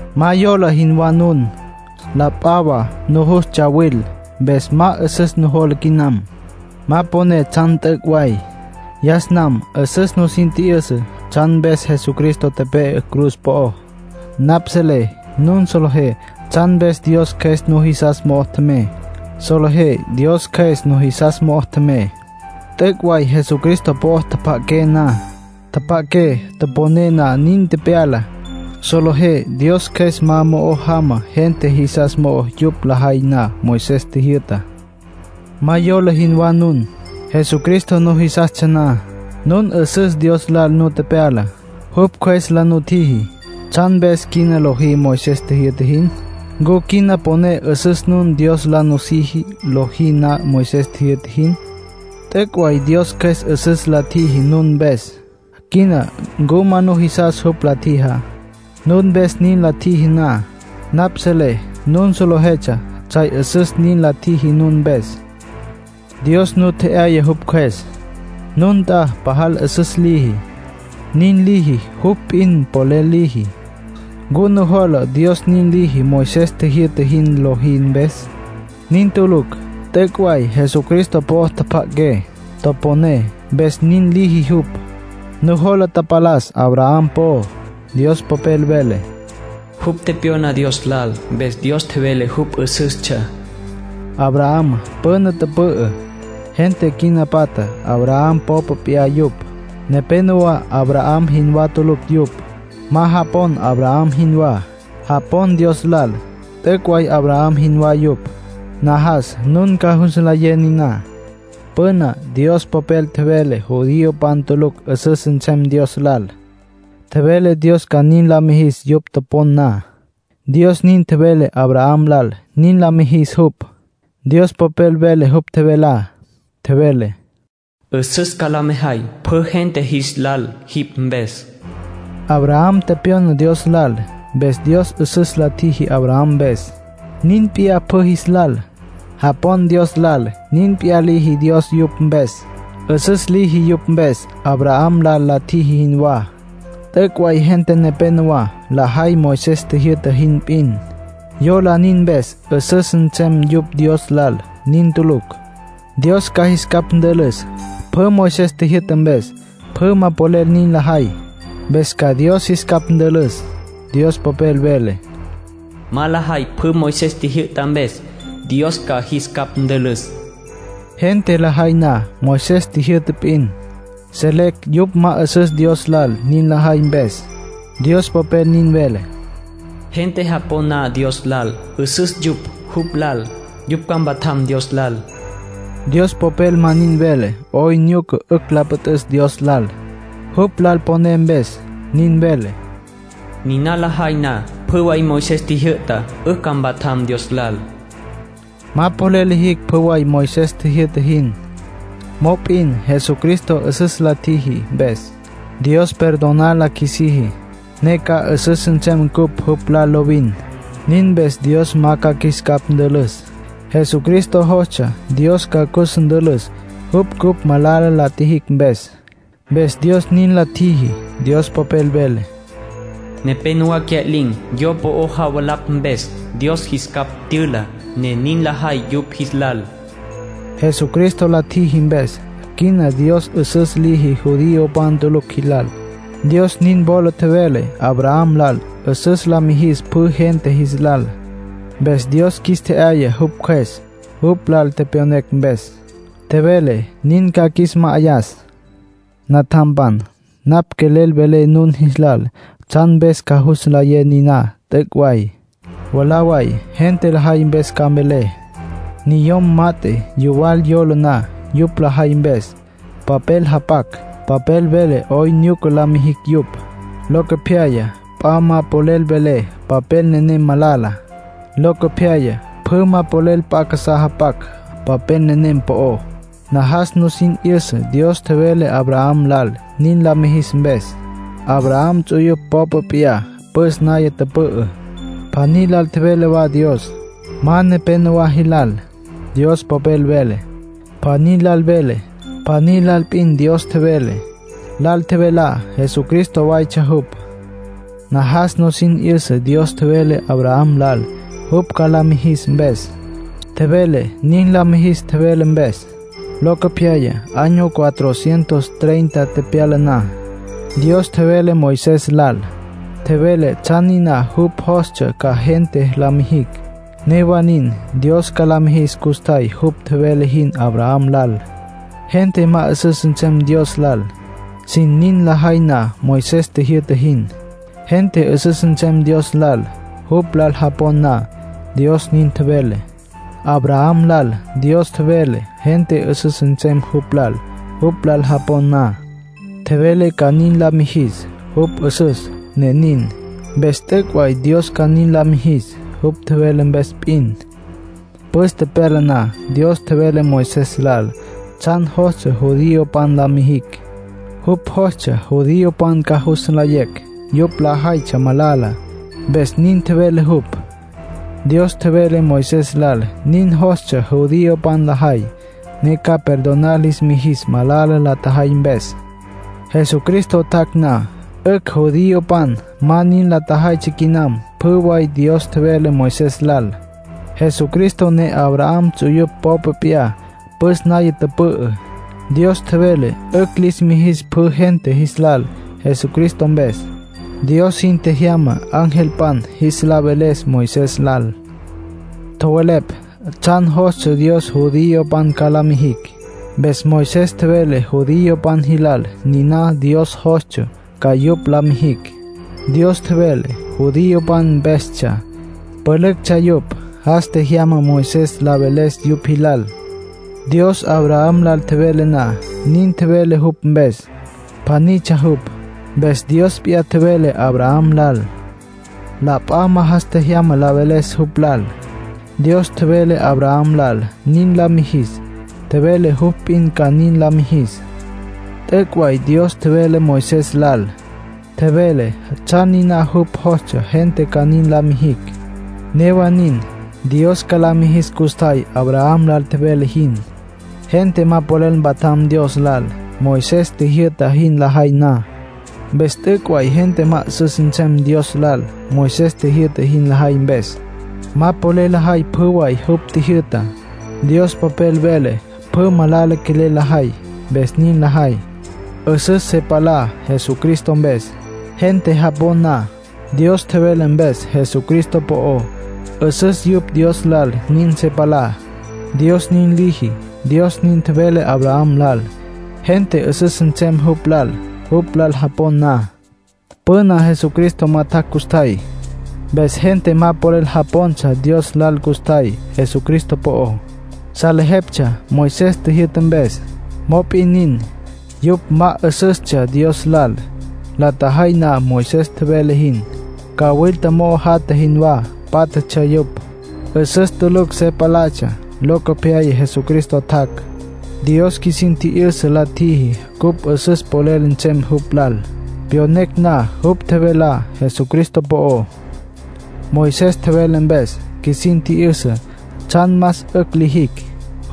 Ma yola jinwá nun. La p'a wa nujus tsawil, mpes ma 'üsüs nujola quinam. Ma poné tsjan t'üc' way. Yas nam 'üsüs nusin tji'yüsa tsjan mpes Jesucristo tepe'e cruz po'ó. Napj selé nun solejé tsjan mpes Dios Cjües nujisas mo'o tjemey. Solejé Dios Cjües nujisas mo'o tjemey, t'üc' way Jesucristo po'o tjapja'aqué na. Tjapja'aqué toponé na nin tepyala. Solejé Dios Cjües ma mo'o jama gente jisas mo'ó yupj lajay na Moisés tjijyü'tá. Ma yola jinwá nun. Jesucristo nujisastsja na, nun 'üsüs Dios lal nu tepyala, jupj Cjües la nutjiji. ¿Tsjan mpes quina lojí Moisés tjijyü'ta jin? ¿Ncu quina poné 'üsüs nun Dios la nusiji, lojí na Moisés tjijyü'ta jin? T'üc' way Dios Cjües 'üsüs la tjiji nun mpes. Quina ¿ncu ma nujisas jupj la tjijá? Nun mpes nin la tjiji na, napj selé nun solejetsja tsjay 'üsüs nin la tjiji nun mpes. Dios nu tje'yaya jupj Cjües. Nun nt'a pajal 'üsüs liji. Nin liji, jupj p'in polel liji. ¿Ncu nujola Dios nin liji, Moisés tjijyü'ta jin lojí mpes? Nin tulucj. T'üc' way Jesucristo po'o tjapja'aqué, toponé, mpes nin liji jupj. Nujola tapalas Abraham po'ó. Dios Popel vele: “Jupj tepyona Dios lal. Mpes Dios tjevele jupj 'üsüstsja.” Abraham püna tüpü'ü. Gente quina patja, Abraham popa p'iyá yupj. Nepénowa Abraham jinwá tulucj yupj; ma japon Abraham jinwá. Japon Dios lal, t'üc' way Abraham jinwá yupj. Najas nun ca jus nlayé niná. Püna Dios Popel tjevele judiopan tulucj 'üsüs nsem Dios lal, tjevele Dios ca nin la mijis yupj topon na. Dios nin tjevele Abraham lal nin la mijis jupj. Dios Popel vele jupj tjevelá. Tjevele: “'Üsüs ca la mejay pjü gente jis lal jipj mpes”. Abraham tepyona Dios lal. Mpes Dios 'üsüs la tjiji Abraham mpes. Nin p'iyá pjü jis lal. Japon Dios lal, nin p'iyá liji Dios yupj mpes. 'Üsüs liji yupj mpes, Abraham lal la tjiji jinwá. T'üc' way gente nepénowa lajay Moisés tjijyü'ta jin p'in. Yola nin mpes 'üsüs nsem yupj Dios lal. Nin tulucj. Dios ca jis capj ntülüs. Pjü Moisés tjijyü'ta mpes, pjü ma polel nin lajay. Mpes ca Dios jis capj ntülüs. Dios Popel vele: “Ma lajay pjü Moisés tjijyü'ta mpes, Dios ca jis capj ntülüs”. Gente lajay na Moisés tjijyü'ta p'in, selecj yupj ma 'üsüs Dios lal nin lajay mpes. Dios Popel nin vele: “Gente japon na Dios lal, 'üsüs yupj jupj lal. Yupj ca mpatjam Dios lal.” Moisés popel ma nin vele 'oyn nyuca 'ücj la püt'üs Dios lal, jupj lal poné mpes. Nin vele: “Niná lajay na pjü way Moisés tjijyü'tá, 'ücj ca mpatjam Dios lal”. Ma polel lijicj pjü way Moisés tjijyü'ta jin. Mop'in Jesucristo 'üsüs la tjiji mpes, Dios perdonar la qjuisiji, ne ca 'üsüs nsem cupj jupj lal lovin. Nin mpes Dios ma ca qjuis capj ntülüs. Jesucristo jostsja Dios ca cus ntülüs jupj cupj malala la tjijicj mpes. Mpes Dios nin la tjiji. Dios Popel vele: “Nepénowa cya'lin̈ yo po'o javalapj mpes. Dios jis capj tyüla, ne nin lajay yupj jis lal.” Jesucristo la tjiji mpes, quina Dios 'üsüs liji judiopan tulucj jilal. Dios nin wola tjevele Abraham lal 'üsüs la mijis pjü gente jis lal. Mpes Dios qjuis tje'yaya jupj Cjües, jupj lal tepyonecj mpes. Tjevele nin ca qjuis ma'ayas. Natjampan, napj quelel velé nun jilal tsjan mpes ca jus nlayé niná t'üc' way. Mwalá way, gente lajay mpes ca mvelé. Niyom mat'e yuwal yola na yupj lajay mpes, papel japac. Papel vele 'oyn nyuca la mijicj yupj. Locopyaya p'a ma polel vele papel nenem malala. Locopyaya pjü ma polel p'a casá japac papel nenem po'ó. Najas nusin 'yüsa Dios tjevele Abraham lal nin la mijis mpes. Abraham ts'uyupj popa p'iyá püs naya tüpü'ü, pjaní lal tjevele wa Dios. Ma “nepénowa jilal”, Dios Popel vele. “Pjaní lal”, vele. Pjaní lal p'in Dios tjevele. Lal tjevelá Jesucristo waytsja jupj. Najas nusin 'yüsa Dios tjevele Abraham lal jupj ca la mijis mpes. Tjevele nin la mijis tjevele mpes. Locopyaya, año cuatrocientos treinta tepyala na, Dios tjevele Moisés lal. Tjevele tsjan niná jupj jostsja ca gente la mijicj. Newa nin, Dios ca la mijis custjay jupj tjevele jin Abraham lal. Gente ma 'üsüs nsem Dios lal, sin nin lajay na Moisés tjijyü'ta jin. Gente 'üsüs nsem Dios lal, jupj lal japon na, Dios nin tjevele. Abraham lal Dios tjevele gente 'üsüs nsem jupj lal jupj lal japon na. Tjevele ca nin la mijis. Jupj 'üsüs, ne nin. Mpes t'üc' way Dios ca nin la mijis, jupj tjevele mpes p'in. Püs tepyala na Dios tjevele Moisés lal tsjan jostsja judiopan la mijicj. Jupj jostsja judiopan ca jus nlayecj yupj lajaytsja malala, mpes nin tjevele jupj. Dios tjevele Moisés lal nin jostsja judiopan lajay, ne ca perdonar lis mijis malala la tjajay mpes. Jesucristo tjac' na, 'ücj judiopan ma nin la tjajaytsja quinam pjü way Dios tjevele Moisés lal. Jesucristo ne Abraham ts'uyupj popa p'iyá püs naya tüpü'ü. Dios tjevele 'ücj lis mijis pjü gente jis lal Jesucristo mpes. Dios sin tjejyama angelpan jis la veles Moisés lal. Tjowelepj tsjan jostsja Dios judiopan ca la mijicj. Mpes Moisés tjevele judiopan jilal niná Dios jostsja ca yupj la mijicj. Dios tjevele, judiopan mpestsja, pülüctsja yupj. Jas tjejyama Moisés la veles yupj jilal. Dios Abraham lal tjevele na, nin tjevele jupj mpes, pjanitsja jupj. Mpes Dios p'iyá tjevele Abraham lal. La p'a ma jas tjejyama la veles jupj lal. Dios tjevele Abraham lal nin la mijis, tjevele jupj p'in ca nin la mijis. T'üc' way Dios tjevele Moisés lal. Tjevele tsjan niná jupj jostsja gente ca nin la mijicj. Newa nin, Dios ca la mijis custjay Abraham lal tjevele jin. Gente ma polel mpatjam Dios lal Moisés tjijyü'ta jin lajay na. Mpes t'üc' way gente ma 'üsüs nsem Dios lal Moisés tjijyü'ta jin lajay mpes. Ma polel lajay pjü way jupj tjijyü'tá. Dios Popel vele pjü malala quelel lajay. Mpes nin lajay. 'Üsüs se palá Jesucristo mpes. Gente japon na, Dios tjevele mpes Jesucristo po'ó, 'üsüs yupj Dios lal nin se palá, Dios nin liji. Dios nin tjevele Abraham lal, gente 'üsüs nsem jupj lal, jupj lal japon na. Püna Jesucristo ma tjac' custjay. Mpes gente ma polel japontsja Dios lal custjay Jesucristo po'ó. Salejeptsja Moisés tjijyü'ta mpes. Mop'in nin, yupj ma 'üsüstsja Dios lal, la tjajay na Moisés tjevele jin. Cawilta mo'o jatja jinwá pátjatsja yupj. 'Üsüs tulucj se palatsja. Locopyaya Jesucristo tjac'. Dios qjuisin tji'yüsa la tjiji cupj 'üsüs polel nsem jupj lal, pyonecj na jupj tjevelá Jesucristo po'ó. Moisés tjevele mpes, qjuisin tji'yüsa tsjan más 'ücj lijicj.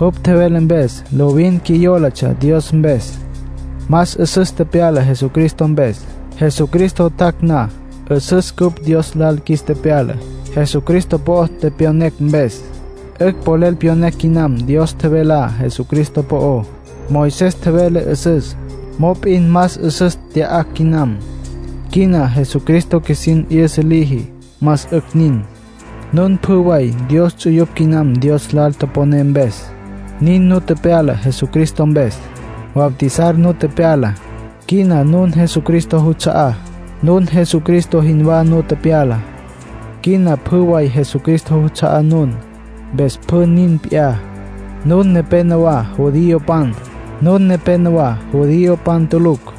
Jupj tjevele mpes, lovin qjuiyólatsja Dios mpes. Más 'üsüs tepyala Jesucristo mpes. Jesucristo tjac' na, 'üsüs cupj Dios lal qjuis tepyala, Jesucristo po'o tepyonecj mpes. 'Ücj polel pyonecj quinam Dios tjevelá Jesucristo po'ó. Moisés tjevele 'üsüs. Mop'in más 'üsüs tya'acj quinam. Quina Jesucristo qjuisin 'yüsa liji. Más 'ücj nin. Nun pjü way Dios ts'uyupj quinam Dios lal toponé mpes. Nin nu tepyala Jesucristo mpes. Bautizar nu tepyala. Quina nun Jesucristo juts'a'á. Nun Jesucristo jinwá nu tepyala. Quina pjü way Jesucristo juts'a'á nun, mpes pjü nin p'iyá. Nun nepénowa judiopan. Nun nepénowa judiopan tulucj.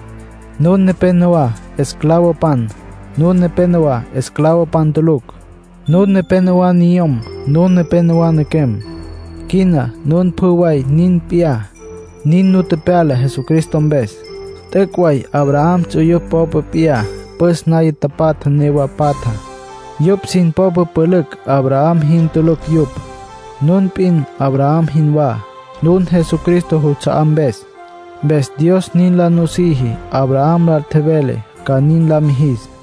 Nun nepénowa esclavopan. Nun nepénowa esclavopan tulucj. Nun nepénowa niyom. Nun nepénowa nequem. Quina nun pjü way nin p'iyá, nin nu tepyala Jesucristo mpes. T'üc' way Abraham ts'uyupj popa p'iyá püs naya tapatja newa patja. Yupj sin popa pülücj Abraham jin tulucj yupj. Nun p'in Abraham jinwá, nun Jesucristo juts'a'á mpes. Mpes Dios nin la nusiji Abraham lal tjevele ca nin la mijis.